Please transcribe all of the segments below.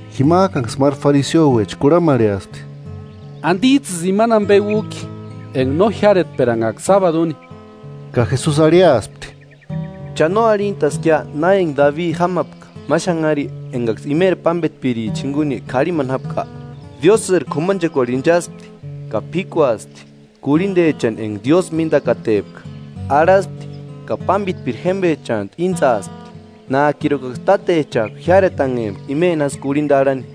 Jimajkanksï máru fariseouecha kurhamarheaspti: –¿Andijtsïsï imani ambe újki enga no jiáretperanhajka sábadu úni? Ka Jesusi arhiaspti: –¿Cha no arhintaskia na enga Dabi jámapka ma xanhari engaksï imeri pámbetpiricha jinguni k'arhimani jápka? Diósïri k'umanchekuarhu inchaspti ka p'íkuaspti kurhindechani enga Diósï míndakatepka, arhaspti ka pámbetpiri jémbechantu íntsaspti, nájkirukaksï tátechajku jiáretanhempka imeni jásï kurhinda arhani.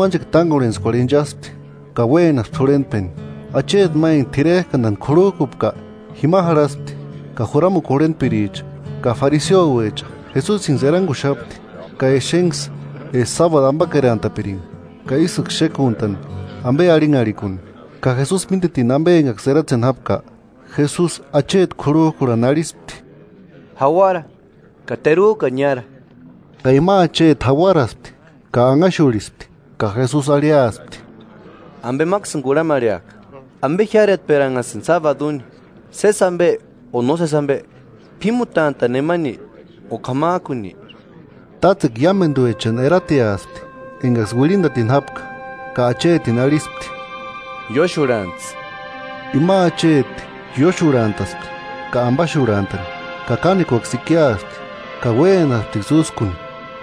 Máteru sábadu, Jesusi k'umanchekua tángorhentskuarhu inchaspti ka uénaspti jurhentpeni. Acheti ma enga t'irerkandani k'urhujkupka jima jarhaspti; ka juramukua jurhentpiricha ka fariseouecha Jesusinksï eranguxapti ka exenksï eska sábadu ambakerantapiringa, ka ísïksï xékuntani ambe arhinharhikuni. Ka Jesusi mítetini ambe engaksï eratseni jápka, Jesusi acheti k'urhujkurhani arhispti: –Jauara ka terujkani niára. Ka ima acheti jauaraspti ka anhaxurhispti, ka Jesusi arhiaspti: –Ambe máksïni kurhamarheaka: ¿Ambe jiáretperanhasïnki sábadu úni: Sési ambe o nósesi ambe? ¿P'ímutantani nemani o k'amajkuni? Tátsekua iámenduechani erateaspti engaksï uirhindatini jápka, ka achetini arhispti: –Ióxurhantsï. Ima acheti ióxurhantaspti ka ambaxurhantani. Ka kánekuaksï ikiaspti, ka uénasptiksï úskuni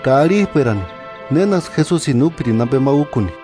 ka arhijperani nénaksï Jesusini úpirini ambe ma úkuni.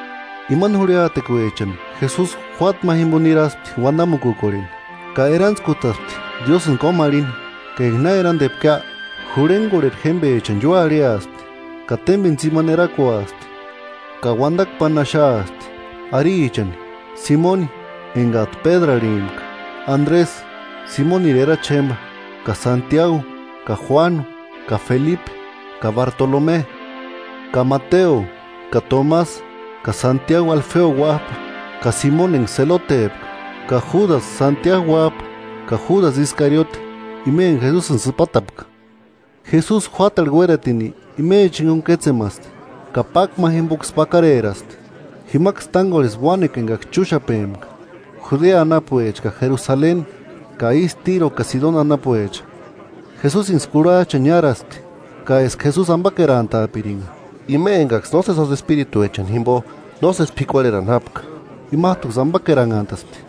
Imani jurhiatekuechani Jesusi juáta ma jimbo niraspti uandamukukorheni, ka erantskutaspti Diósïni kómarhini. Ka enga na erandepkia, jurhengorheri jémbechani ióarhiaspti, ka témbeni tsimani erakuaspti, ka uandakua páni axaaspti. Arichani: Simoni, engajtu Pédru arhimpka; Andresï, Simoniri erachi jémba ka Santiagu ka Juánu ka Felipe ka Bartolome ka Mateo ka Tomasï ka Santiagu Alfeo uájpa; ka Simoni enga Selotepka; ka Júdasï Santiagu uájpa; ka Júdasï Iskariote, ima enga Jesusini sïpatapka. Jesusi juátarhu uératini imecha jinguni kétsemaspti, ka pákua ma jimboksï pakareraspti. Jimaksï tángorhespti uánekua engaksï chúxapempka, Judea anapuecha ka Jerusaleni ka ístu Tíro ka Sidoni anapuecha. Jesusinksï kurhajchani niáraspti, ka eska Jesusi ambakerantaapiringa. Ima engaksï nósesi jásï espirituechani jimbo nósesi p'ikuarherani jápka, imajtuksï ambakeranhantaspti.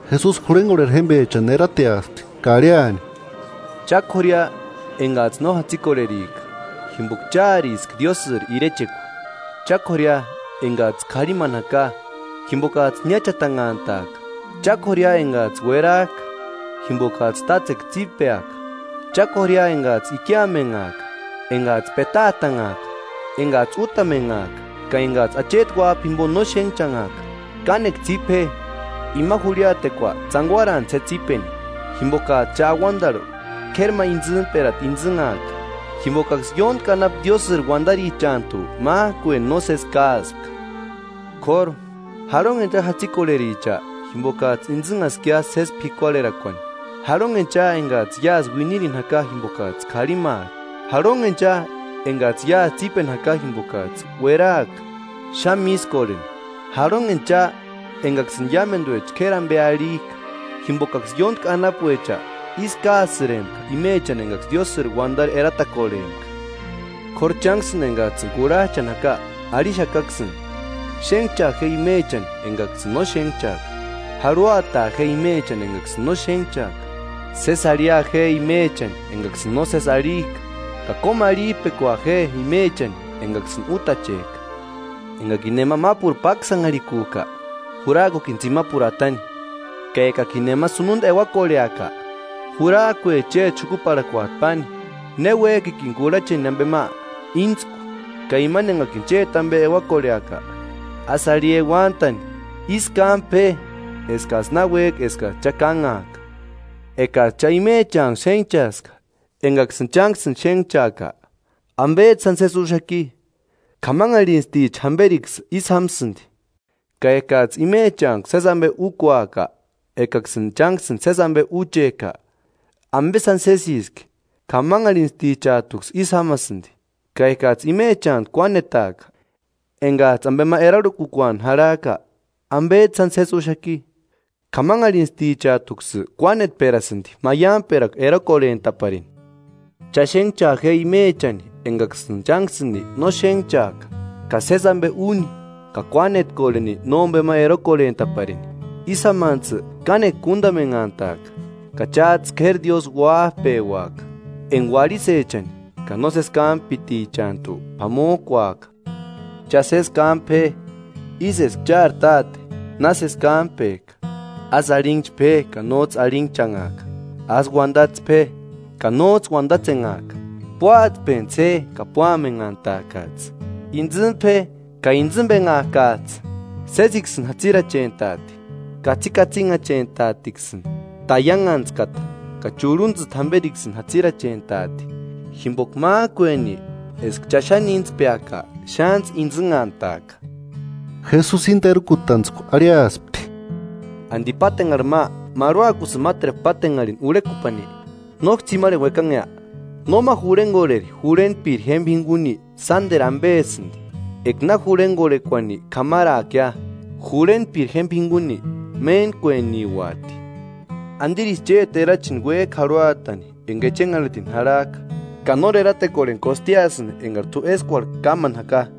Jesusi jurhengorheri jémbechani erateaspti ka arhiani: “Cha k'ória engajtsï no jatsikorherika, jimboka cháriska Diósïri irechekua.” “Cha k'ória engajtsï k'arhimani jaka, jimbokajtsï niáchatanhantaaka.” “Cha k'ória engajtsï uerajka, jimbokajtsï tátsekua tsípeaka.” “Cha k'ória engajtsï ikiamenhajka, engajtsï petaatanhajka, engajtsï útamenhajka, ka engajtsï Acheti Uájpani jimbo no xénhchanhajka.” “Kánekua tsípe je ima jurhiatekua, tsanguarantsï je tsípeni, jimbokajtsï cha auandarhu k'éri ma intsïmperata intsïnhaaka; jimbokaksï ióntki anapu Diósïri uandarichantu májkueni nósesi káaspka.” K'óru, “¡Jarhonheni cha jatsikorhericha, jimbokajtsï intsïnhaskia sési p'ikuarherakuani!” “¡Jarhonheni cha engajtsï iásï uinirini jaka jimbokajtsï k'arhimaaka!” “¡Jarhonheni cha engajtsï iásï tsípeni jaka jimbokajtsï ueraska xáni mískorheni!” “¡Jarhonheni cha engaksïni iámenduecha k'éri ambe arhijka! Jimbokaksï ióntki anapuecha ísï káasïrempka imechani engaksï Diósïri uandari eratakorhempka.” “K'óru chánksïni engajtsïni kurhajchani jaka arhixakaksïni: Xénhchaa je imechani engaksïni no xénhchajka, jarhuataa je imechani engaksïni no xénhchajka, sési arhia je imechani engaksïni nósesi arhijka, ka kómarhijpekua je imechani engaksïni útachejka. Engakini nema mápuru páksanharhikujka, jurajkukini tsimapuru atani; ka ekakini nema sununda euakorheaka, jurajkue chéti xukuparhakuajtu páni. Ne uéjkikini kurhacheni ambe ma, íntsku, ka imani engakini chéti ambe euakorheaka, ásï arhi euantani. Ísï kámpe je eskajtsï na uéjka eskajtsï cha kánhaaka. Ekajtsï cha imechanku xénhchkaaska engaksïni chánksïni xénhchkajka, ¿Ambejtsï sáni sési úxaki? K'amanharhintsticha jamberiksï ísï jámsïndi. Ka ekajtsï imechantku sési ambe úkuajka ekaksïni chánksïni sési ambe úchejka, ¿Ambe sáni sésiski? K'amanharhintstichajtuksï ísï jámasïndi. Ka ekajtsï imechantku kuánetaajka engajtsï ambe ma erarhukukuani jarhajka, ¿Ambejtsï sáni sési úxaki? K'amanharhintstichajtuksï kuánetperasïndi maiamperakua erokorhentaparini. Cha xénhchaa je imechani engaksïni chánksïni no xénhchajka, ka sési ambe úni, ka kuánetkorheni nómbema erokorhentaparini. Ísï jámantsï kánekua kúndamenhantaaka, ka chájtsï k'éri Diósï uájpeuaka, enga uarhisechani ka nósesi kámpitichantu p'amojkuajka.” “Cha sési kámpe je, ísï eska chári Táte na sési kámpejka. Ásï arhinhchpe je, ka nójtsï arhinhchanhaaka. Ásï uandatspe je ka nójtsï uandatsenhaaka. Púatspentsï je ka púamenhantaakajtsï. Íntsïmpe je ka íntsïmbenhaakajtsï. Sésiksïni jatsirachentaati, katsikatsinhachentaatiksïni, taianhantskata ka churhuntsïti jamberiksïni jatsirachentaati. Jimboka májkueni eska cha xáni íntspeaka, xántsï intsïnhantaaka.” Jesusi íni terukutantskua arhiaspti: “¿Andi pátenharhi ma marhuakusïni máteru pátenharhini urhekupani? ¿Nóksï tsimarheni uekanhea? Nóma jurhengorheri jurhentpiri jémba jinguni sánderu ambesïndi: Eka na jurhengorhekuani k'amaraakia, jurhentpiri jémba jinguni méntkueniuati.” “¿Andirisï chéti erachini uéjki jarhuatani enga echenharhitini jarhajka, ka nóri eratekorheni kostiasïni engari t'u eskuarhu kámani jaka?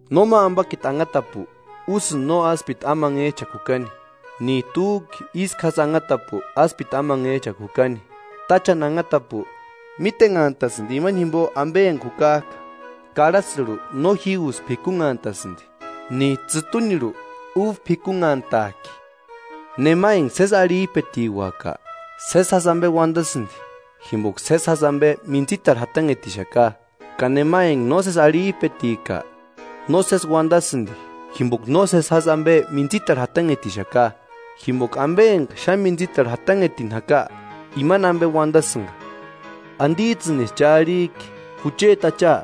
“Nóma ambakiti anhatapu úsïndi no áspiti amanhejchakua jukani, níjtu újki ísku jásï anhatapu áspiti amanhejchakua jukani. Táchani anhatapu mítenhantasïndi imani jimbo ambe enga jukajka: Karhasïrhu no jígusï p'ikunhantasïndi, níjtu tsïtunirhu uba p'ikunhantajki. Nema enga sési arhijpetiuaka, sési jásï ambe uandasïndi, jimboka sési jásï ambe mintsitarhu jatanhetixaka, ka nema enga nósesi arhijpetika, nósesi uandasïndi, jimboka nósesi jásï ambe mintsitarhu jatanhetixaka. Jimboka ambe enga xáni mintsitarhu jatanhetini jaka imani ambe uandasïnga.” “¿Andijtsïnisï cha arhijki ‘Jucheti Acha,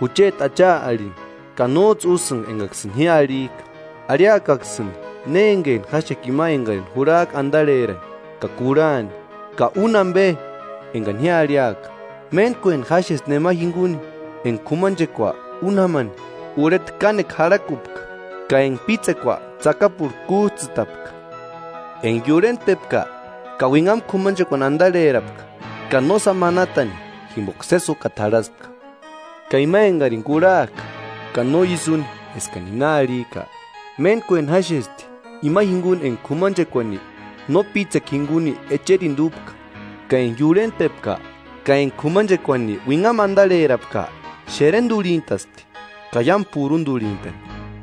jucheti Acha’ arhini, ka nójtsï úsïnga engaksïni ji arhijka? Arhiakaksïni ne engeni jáxeka ima engarini jurhajka andarherani ka kurhani, ka úni ambe engani ji arhiaka: Méntkueni jáxesti nema jinguni enga k'umanchekua úni jámani urheta kánekua jarhakupka ka enga pítsekua tsakapurhu kújtsïtapka. Enga iurhentpepka ka uinhamu k'umanchekuani andarherapka ka nósani manatani jimboka sési úkata jarhaspka. Ka ima engarini kurhajka ka no ísï úni eskani ji na arhijka, méntkueni jáxesti ima jinguni enga k'umanchekuani no pítsekua jinguni echerindu úpka ka enga iurhentpepka ka enga k'umanchekuani uinhamu andarherapka, xerendurhintaspti, ka iámu purundurhintani.”